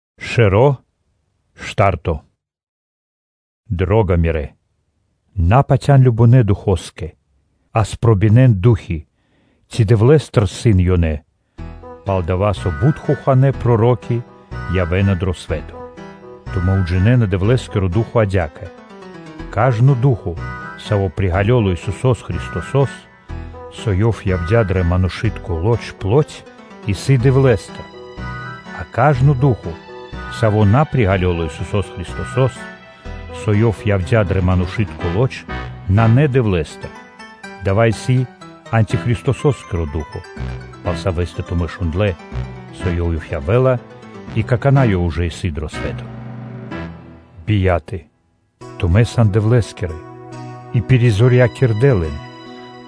Чачуно́ и Хохано́ Ду́хо (Фа́но) Дро́га мирэ́! На патя́н кажнонэ́ духоскэ, а спробинэн (пропатякирэн) ду́хи, ци Дэвлэ́стыр исын ёнэ, пал-дова́ со бут хоханэ́ проро́ки явэ́на дро свэ́то. Тумэ́ уджинэна Дэвлэ́скиро ду́хо (фа́но) адя́кэ: кажно ду́хо (фа́но), саво́ приґалёла Исусо́с Христосо́с, со Ёв явдя́ дро манушы́тко лоч (плоть), исын Дэвлэ́стыр; а кажно ду́хо (фа́но), саво́ на приґалёла Исусо́с Христосо́с, со Ёв явдя́ дро манушы́тко лоч, нанэ Дэвлэ́стыр, дава́ исын антихристоскиро ду́хо (фа́но), пал савэ́стэ тумэ́ шундлэ́, со ёв явэ́ла и какана́ Ёв ужэ исын дро свэ́то. Бияталэ (чхаворэ́)! Тумэ́ сан Дэвлэ́скирэ и пиризорьякирдэ лэн,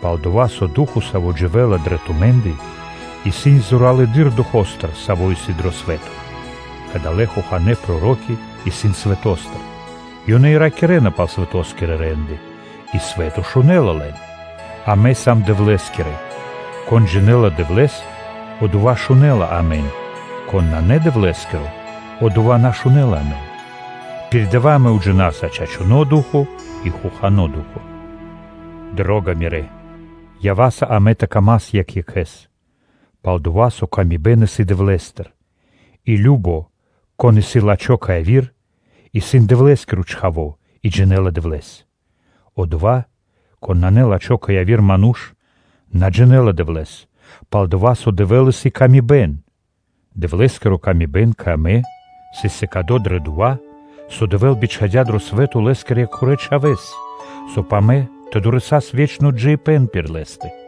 пал-дова́ со Ду́хо (Фа́но), Саво́ дживэ́ла дрэ тумэ́ндэ, исын зоралэды́р духо́стыр, саво́ исын дро свэ́то. Кадалэ́ хоханэ́ проро́ки исын свэто́стыр: ёнэ и ракирэ́на пал свэто́скирэ рэ́нды, и свэ́то шунэ́ла лэн. Амэ сам Дэвлэ́скирэ: кон джинэ́ла Дэвлэ́с, одова́ шунэ́ла амэн; кон на Дэвлэ́скиро, одова́ на шунэ́ла амэн. Пир дава́ амэ уджинаса чачуно́ ду́хо (фа́но) и хохано́ ду́хо (фа́но). Дро́га мирэ́! Ява́са амэ тэ дас паты́в екх екхэ́скэ, пал-дова́ со пшалы́тко паты́в исын Дэвлэ́стыр и кажно (сва́ко), кон исын лачхо́ кэ яви́р, исын Дэвлэ́скиро чхаво́ и джинэ́ла Дэвлэ́с. Одова́, кон исын на́лачхо кэ яви́р ману́ш, на джинэ́ла Дэвлэ́с, пал-дова́ со Дэвэ́л исын пшалы́тко паты́в. Дэвлэ́скири ла́ска кэ амэ сыс сыкады дро дова́, со Дэвэ́л бичхадя́ дро свэ́то Лэ́скирэ Екхорэ Чхавэ́с, соб (кай) амэ тэ дорэсас (тэ долас) ве́чно джиибэ́н пир Лэ́стэ.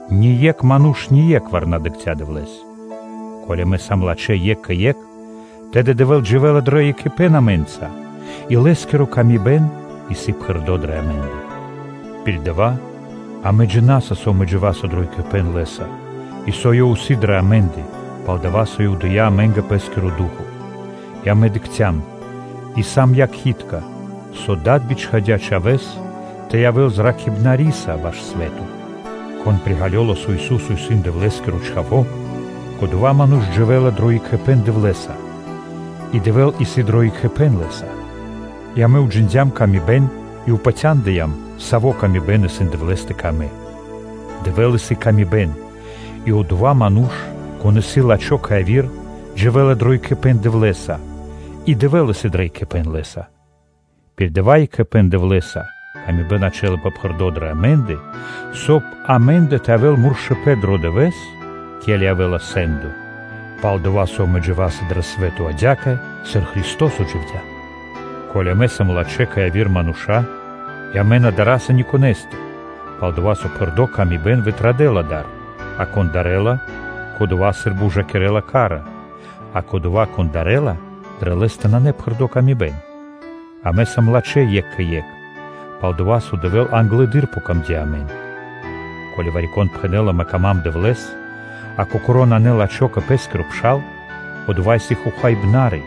Ние́кх ману́ш ние́кхвар на дыкхця́ Дэвлэ́с. Ко́ли амэ сам лачхэ́ екх кэ екх, тэды Дэвэ́л дживэ́ла дро екхипэ́н амэ́нца, и Лэ́скири ла́ска исын пхэрды́ дрэ амэ́ндэ. Пир дава́ амэ уджинаса, со амэ дживаса дро екхипэ́н Лэ́са, и со Ёв исын дрэ амэ́ндэ, пал-дова́ со Ёв дыя́ амэ́нгэ Пэ́скиро Ду́хо (Фа́но). И амэ дыкхцям и сам якхи́тка (якхалэ), со Дад бичхадя́ Чхавэ́с тэ зракхэ́л свэ́то. Кон приґалёла, со Ису́со исын Дэвлэ́скиро Чхаво́, кодова́ ману́ш дживэ́ла дро екхипэ́н Дэвлэ́са, и Дэвэ́л исын дро екхипэ́н лэ́са. И амэ уджиндям ла́ска и упатяндыям, сави́ ла́ска исын Дэвлэ́стэ кэ амэ. Дэвэ́л исын дрэ пшалы́тко паты́в кэ яви́р мануша́, и одова́ ману́ш, кон исын лачхо́ кэ яви́р, дживэ́ла дро екхипэ́н Дэвлэ́са и Дэвэ́л исын дро екхипэ́н лэ́са. Пир дава́ екхипэ́н Дэвлэ́са пшалы́тко паты́в ячэ́лапэ пхэрдо́ дрэ амэ́ндэ, соб (кай) амэ́ндэ тэ явэ́л муршыпэн дро дывэ́с, ке́ли явэ́ла сэ́ндо, пал-дова́ со амэ дживаса дро дава́ свэ́то адя́кэ, сыр Христо́со дживдя́. Ко́ли амэ сам лачхэ́ кэ яви́р мануша́ и амэ на дара́са ни конэ́стыр, пал-дова́ со пхэрды́ паты́в вытрадэла дар, а кон дарэ́ла, кодова́ сы́рбы ужакирэ́ла ка́ра. А кодова́, кон дарэ́ла, дрэ лэ́стэ нанэ пхэрды́ паты́в. Амэ сам лачхэ́ екх кэ екх, пал-дова́ со Дэвлэ́скэ англэды́р яця́м дро́га амэ. Ко́ли вари-кон пхэнэ́ла: “Ма́нгэ исын дро́го Дэвэ́л”, а кокоро́ нанэ лачхо́ кэ пэ́скиро пшал, одова́ исын хохаибнари;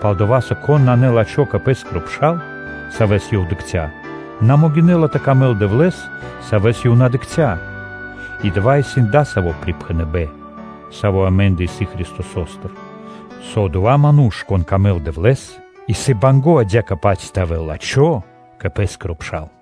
пал-дова́ со кон нанэ лачхо́ кэ пэ́скиро пшал, савэ́с ёв дыкхця́, на могинэ́ла тэ дэл паты́в Дэвлэ́скэ, Савэс ёв на дыкхця́? И дава́ исын дасаво припхэныбэ́н, саво́ амэ́ндэ исын Христосостыр, со одова́ ману́ш, конэ́скэ дро́го исын Дэвэ́л, исын банго́ (мусинэла) адя́кэ-паць тэ явэ́л лачхо́ кэ пэ́скиро пшал.